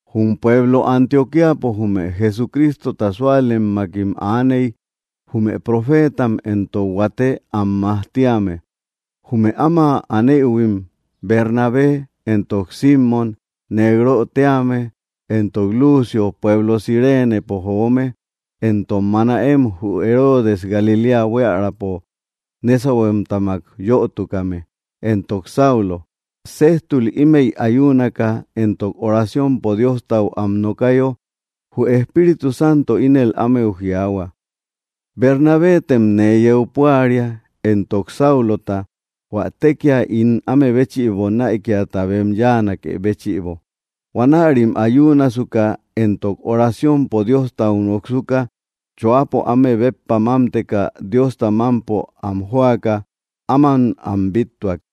Jum pueblo Antioquíapo jume Jesucrístota súalemmakim aaney jume profétam éntok huate am majtíame. Jume áma anéïhuim Bernabé, éntok Símon, Négrö tíame, éntok Lucio, pueblo Cirénepo joome, éntok Manaén jü Herodes Galiléa buiärapo nésauhuemtamak yötukame, éntok Saulo. Séjtul ímëi ayúunaka entok oraciompo Diostau am nokayo, jü Espíritu Santo ínel ámeu jiaahua: —Bernabetem nee yeu púaria, éntok Sáulota, hua tekia ín áme béchïbo näikiata bem yáanakë béchïbo. Huanärim ayúunasuka éntok oraciompo Diostau noksuka, choápo áme béppa mámteka Diosta mampo am joaka áman am bíttuak.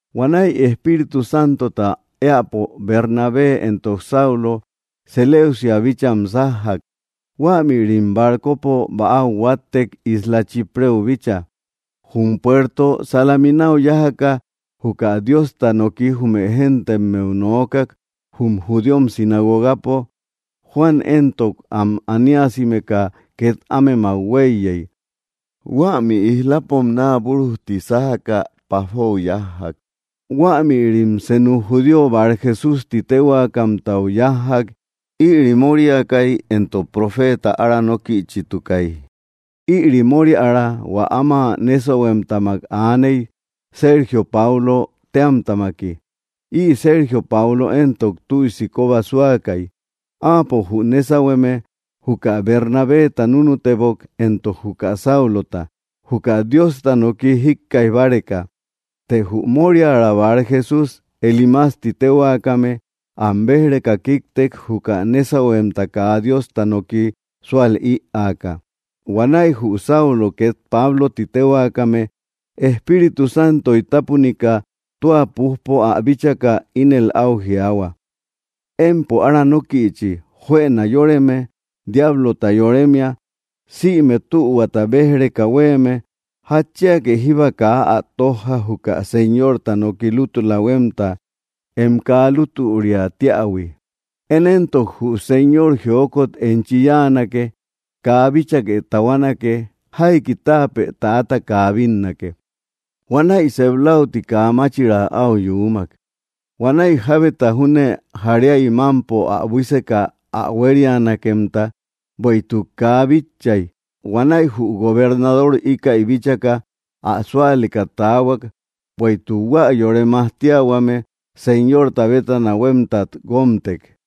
Huanäi Espíritu Santota éäpo Bernabé éntok Saulo Seleuciau bícham sájjak. Huämïrim barcopo bäau huáttek isla Chípreu bícha. Jum puerto Salamínau yájaka juka Diosta noki jume géntemmeu noókak jum judíom sinagogapo. Juan éntok, am aníasimeka ket ámemak huéiyey. Huämi íslapom naa burujti sájaka Páfou yájjak. Huämïrim senu judío Barjesús ti téhuakamtau yájjak. Ïri móriäkai, éntok profeta aranókïchitukai. Ïri móriära hua áma nésauhuemtamak aaney, Sergio Páulö téamtamaki. Ï Sergio Paulö éntok, tüisi koba súakai. Áapo, jü nésauhueme, juka Bernabeta núnutebok, éntok juka Sáulota, juka Diosta noki jíkkaij báreka. Të jü móriära Barjesús, Elímas ti téhuakame, am béj‑reka kíktek, juka nésauhuemta kaa Diosta noki sual ïaaka. Huanäi jü Saulo, ket Páblo ti téhuakame, Espíritu Santoy tapunika, tua pújpo ä bíchaka, ínel au jiaahua: —¡Empo aranókïchi, juëna yóreme, diáblota yoremia, sïme tühuata béj‑reka huéeme! ¿Jatchíake jíba kaa ä tojja juka Señorta noki lútula huemta em kaa lútüriä tíähui? Én éntok, jü Señor jiókot enchi yáanake. Kaa bíchake tahuánake. Jaiki táapë täata kaa bínnake. Huanäi sep läuti kaa máchira au yuumak. Huanäi jábeta júne jaríai mampo ä buíseka ä huérianakemta, bueïtuk kaa bitchai. Huanäi jü gobernador íkäi bíchaka, ä súaleka taahuak, bueïtuk hua yore majtíahuame Señorta bétana huémtat guómtek.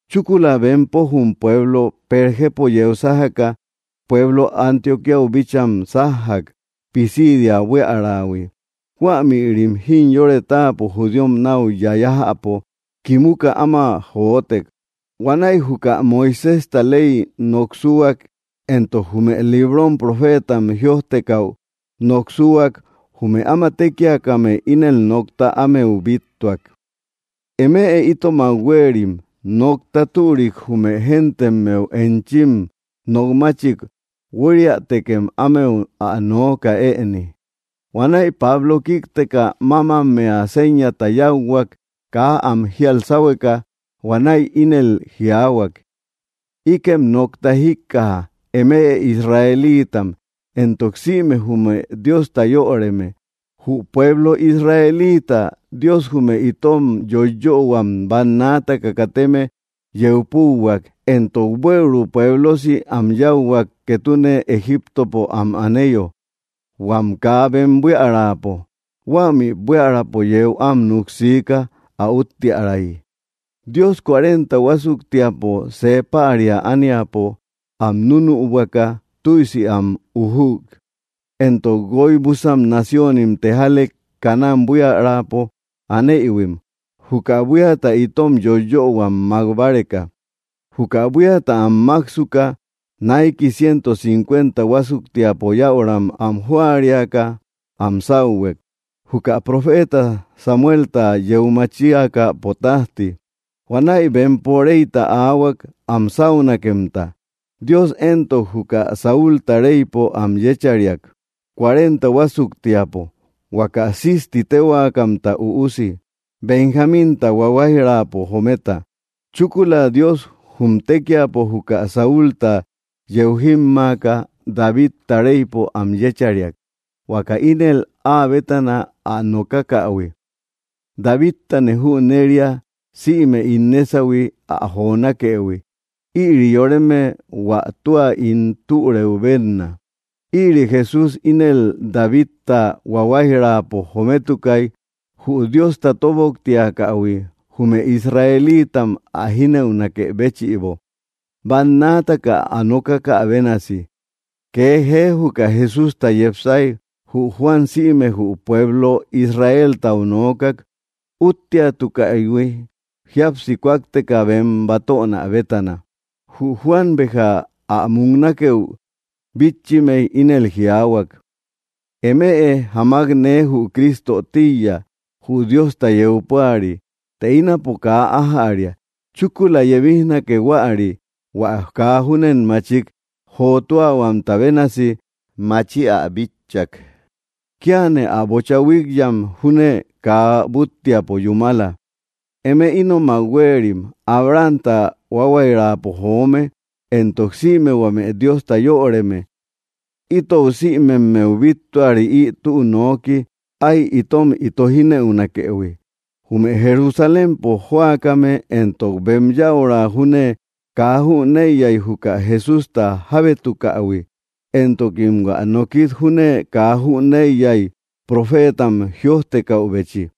Chúkula bempo jum pueblo Pérgepo yeu sájaka pueblo Antioquíau bícham sájjak, Pisidia buíarähui. Huämïrim jimyore táapo judíom nau yayajäpo kimuka áma joótek. Huanäi juka Moiséjta ley noksúak, éntok jume librom profétam jïojtekäu noksúak, jume áma tékiakame ínel nokta ámeu bíttuak: —Eme itomak huéerim, nokta türik jume géntemmeu enchim nokmátchik huériätekem ámeu ä nooka ëni. Huanäi Pablo kíkteka, mámammea séñata yáuhuak kaa am jíal sáhueka. Huanäi ínel jiaahuak: —Íkem nokta jíkkaja, eme Israelíitam éntok sïme jume Diosta yöreme: Jü pueblo Israelíitata Dios jume itom yóyöhuam bannaataka kateme yeu púuhuak, éntok buëuru pueblosi am yáuhuak ketune Egiptopo am aneyo, huam kaa bem buíaräpo. Huämi buíaräpo yéu am nuksiika ä úttiärayi. Dios cuarenta huásuktiapo see päria ániapo am núnübuaka tüisi am ujük, éntok guoi busan naciónim tejálek Canaán buíaräpo anéïhuim, juka buíata itom yóyöhuam mak báreka. Juka buíata am máksuka, naiki ciento cincuenta huásuktiapo yäuram am jóariaka am sáuhuek, juka profeta Samuelta yeu machíakäpo tajti. Huanäi bempo reyta áahuak am sáunakemta. Dios éntok, juka Sáulta reypo am yéchariak cuarenta huásuktiapo, huaka Cis ti téhuakamta üusi, Benjaminta huáhuairapo jometa. Chúkula Dios jum tékiapo juka Saulta yeu jímmaaka, Davidta reypo am yéchariak, huaka ínel áa bétana ä nokákähui: “Davidtane jüneria sïme ín nésauhui ä jonákëhui. Ïri yoreme hua tua ín türëu benna.” Ïri Jesús ínel Davidta huáhuairapo jométukai, jü Diosta tóboktiakähui jume Israelíitam ä jínëunakë béchïbo, bannaataka ä nokakä bénasi. Kee jee juka Jesústa yepsái, jü Juan sïme jü pueblo Israéltau noókak útteatukähui jíapsi kúakteka bem batöna bétana. Jü Juan béja ä muknákëu bítchimei ínel jiáhuak: “Eme jamak nee jü Crísto tíiya, jü Diosta yeu púari, të ínapo kaa ájäria. Chúkula yebíjnake huäri, hua kaa júnen machik jotúahuamta bénasi maachi ä bíchäpo. Kíane ä bocha huíkyam júne kaa búttiapo yúmala.” ’Eme ínomak huéerim, Abrahamta huáhuairapo joome, éntok sïme huame Diosta yöreme: itou sïmemmeu bíttuari ï tü nooki ái itom ito jínëunakëhui. Jume Jerusalémpo jóakame éntok bem yäura júne kaa jüneiyai juka Jesústa jábétukähui, éntokim hua nókit júne kaa jüneiyai profétam jïojtekäbechi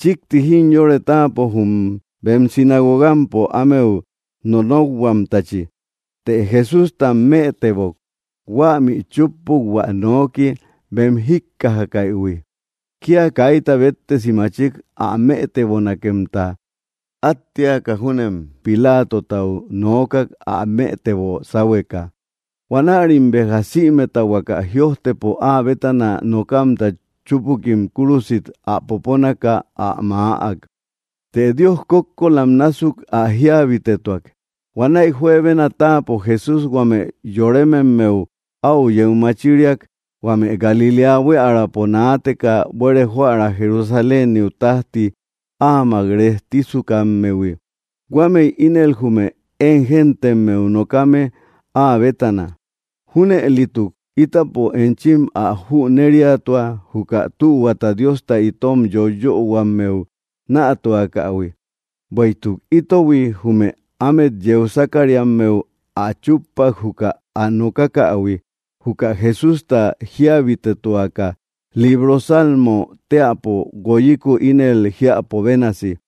chikti jimyore táapo jum bem sinagogampo ámeu nonókhuamtachi. Të Jesústam mëtebok, huämi chúppuk hua nooki bem jíjikkajaïhui. Kia kaita béttesi machik ä mëtebonakemta at téaka júnem Pilátotau noókak ä mëtebo sáhueka. Huanärim béja sïmeta huaka jïojtepo áa bétana nokamta chúpukim kúrusit ä poponaka ä maäak. Të Dios kókkolam násuk ä jíabitetuak. Huanäi juebena táapo Jesús huame yorémemmeu au yeu machíriak, huame Galiléa buiärapo naateka buere joära Jerusaléniu tajti áamak rejtísukammehui. Huámëi ínel jume én géntemmeu nokame áa bétana. ’Júnëlituk, ítapo enchim ä jünériatua juka tühuata Diosta itom yóyöhuammeu nätuakähui. Bueïtuk ítohui, jume ámet yeu sákariammeu ä chúppak juka ä nokákähui juka Jesústa jíabitetuaka, libro Salmo teäpo guoyiku ínel jiäpo bénasi: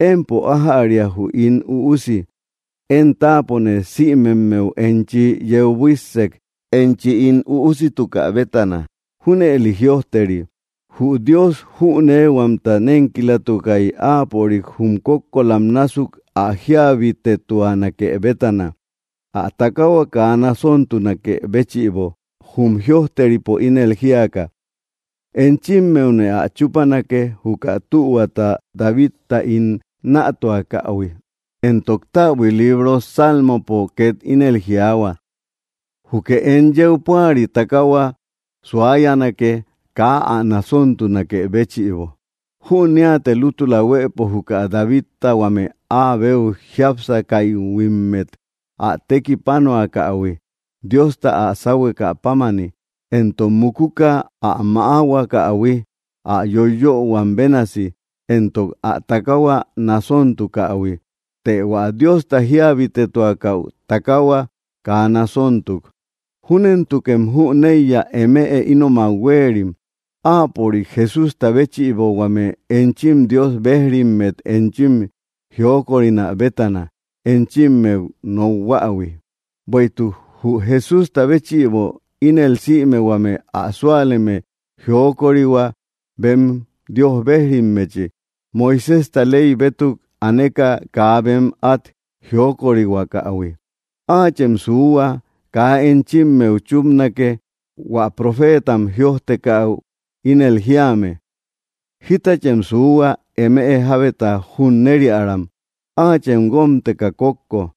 “Empo ájäria jü ín üusi. Én táapone sïmemmeu enchi yeu buíssek enchi ín üúsitukä bétana.” Júnëli jïojteri. Jü Dios jünéehuamta nénkilatukai áapörik jum kókkolam násuk ä jíabitetuanake bétana ä takahua kaa nasóntunakë béchïbo, jum jïojteripo ínel jíaka: “Enchímmeune ä chúpanake juka tühuata Davidtau ín nätuakähui.” Éntok täbui libro Sálmopo ket ínel jiaahua: “Júkë em yeu púari takahua suáyanake kaa ä nasóntunakë béchïbo.” Jünéate lútula huëpo juka Davidta huame áa beu jiápsakaïhuimmet ä tekipánoakähui Diosta ä sáuhuekä pámani, éntok mukuka ä mäáhuakähui ä yóyöhuam bénasi, éntok ä takahua nasóntukähui. Të hua Diosta jíabitetuakäu takahua kaa nasóntuk. Júnentukem jüneiya, eme ínomak huéerim, áapörik, Jesústa, béchïbo huame enchim Dios bejrimmet enchim jiókorinä bétana enchimmeu nokhuähui. Bueïtuk jü Jesústa béchïbo ínel sïme huame ä súaleme jiókorihua bem Dios bejrimmechi, Moiséjta ley bétuk aneka kaa bem at jiókorihuakähui. Áachem suuhua kaa enchimmeu chúpanake hua profétam jïojtekäu ínel jíame: Jítachem suuhua, eme jábeta junnériäram. Áachem guómteka kókko.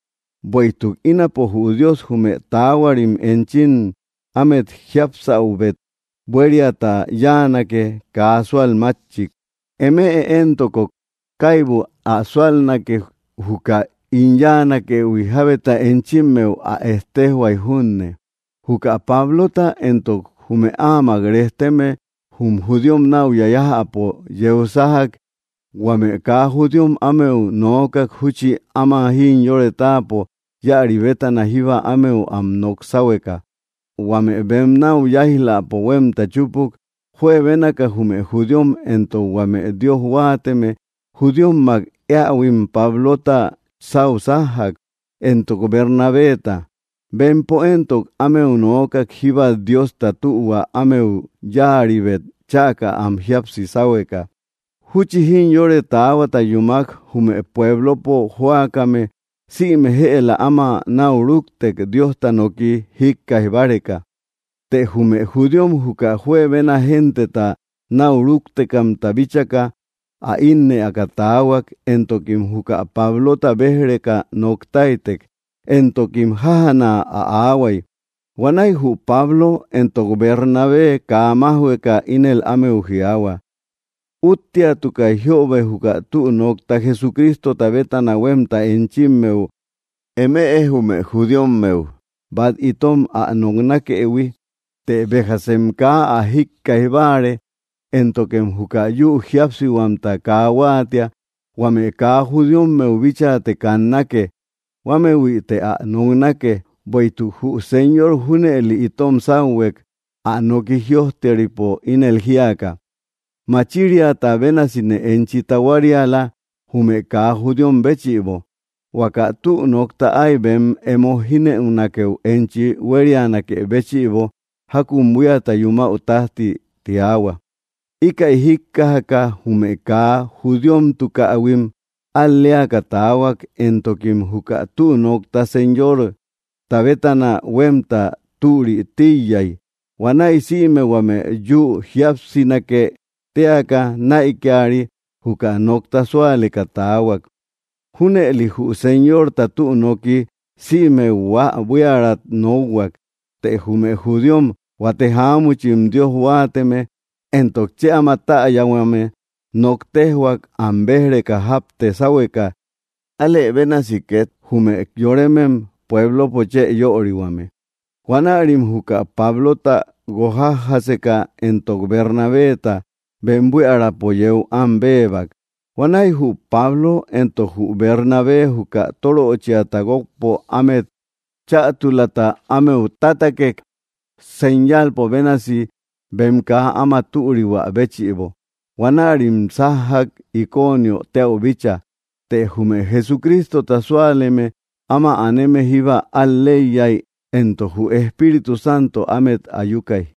Bueïtuk ínapo, jü Dios, jume taáhuarim enchim ámet jíapsáubet buériata yáanake kaa súalmatchik, emë éntok, kaibu ä súalnake juka ín yáanakëhui, jábeta enchimmeu ä ettejhuay junne. Juka Pablota éntok jume áamak rejteme jum judíom nau yayajäpo yeu sájak, huame kaa judíom ámeu noókak júchi áma jimyore táapo íäri bétana jíba ámeu am nok sáhueka. Huame bem nau yáij‑läpo huemta chúpuk, juebénaka jume judíom éntok huame Dios huáateme judíommak éaïhuim Pablota sau sajjak, éntok Bernabeta. Bempo éntok, ámeu nökak jíba Diosta tühua ámeu yáaribet chäka am jíapsi sáhueka. Júchi jimyore taáhuata yúmak, jume puéblopo jóakame sïme jëla áma nau rúktek Diosta noki jíkkaij báreka. Të jume judíom juka juebena genteta nau rúktekamta bíchaka ä ínnëaka taahuak, éntokim juka Pablota béj‑reka noktáitek, éntokim jájana ä aahuai. Huanäi jü Pablo éntok Bernabé kaa májhueka ínel ámeu jiaahua: —Útteatukai jiöbe juka tü nokta Jesucrístota bétana huemta enchimmeu, eme jume judíommeu, bat itom ä noknákëhui. Të béjasem kaa ä jíkkaij báare, éntokem juka yu jíapsihuamta kaa huáatia, huame kaa judíommeu bíchate kannake. Huámehuïte ä noknake. Bueïtuk jü Señor junëli itom sáuhuek, ä noki jïojteripo ínel jíaka: Machiriata bénasine enchi tahuáriala jume kaa judíom béchïbo, huaka tü nokta ái bem emo jínëunakeu enchi huérianakë béchïbo jakun buíata yumäu tajti, tiahua. Íkäi jíkkajaka, jume kaa judíomtukähuim al‑léaka taahuak, éntokim juka tü nokta Señorta bétana huemta türitíiyai. Huanäi sïme huame yu jíapsinake téaka näikiari juka nokta súaleka taahuak. Júnëli jü Señorta tü nooki sïme huaa buíarat nókhuak. Të jume judíom huate jaámuchim Dios huáateme éntok chë áma täyahuame nok téjhuak am béj‑reka japte sáhueka, álë bénasi ket jume yorémem puéblopo chë yörihuame. Huanärim juka Pablota guokjájaseka, éntok Bernabeta, bem buíaräpo yéu am béebak. Huanäi jü Pablo éntok jü Bernabé juka tóröchiata guokpo ámet chätulata ámeu tátakek señalpo bénasi bem kaa áma türihuä béchïbo. Huanärim sájjak Iconiö téäu bícha. Të jume Jesucrístota súaleme áma aneme jíba al‑leiyai éntok jü Espíritu Santo ámet ayukay.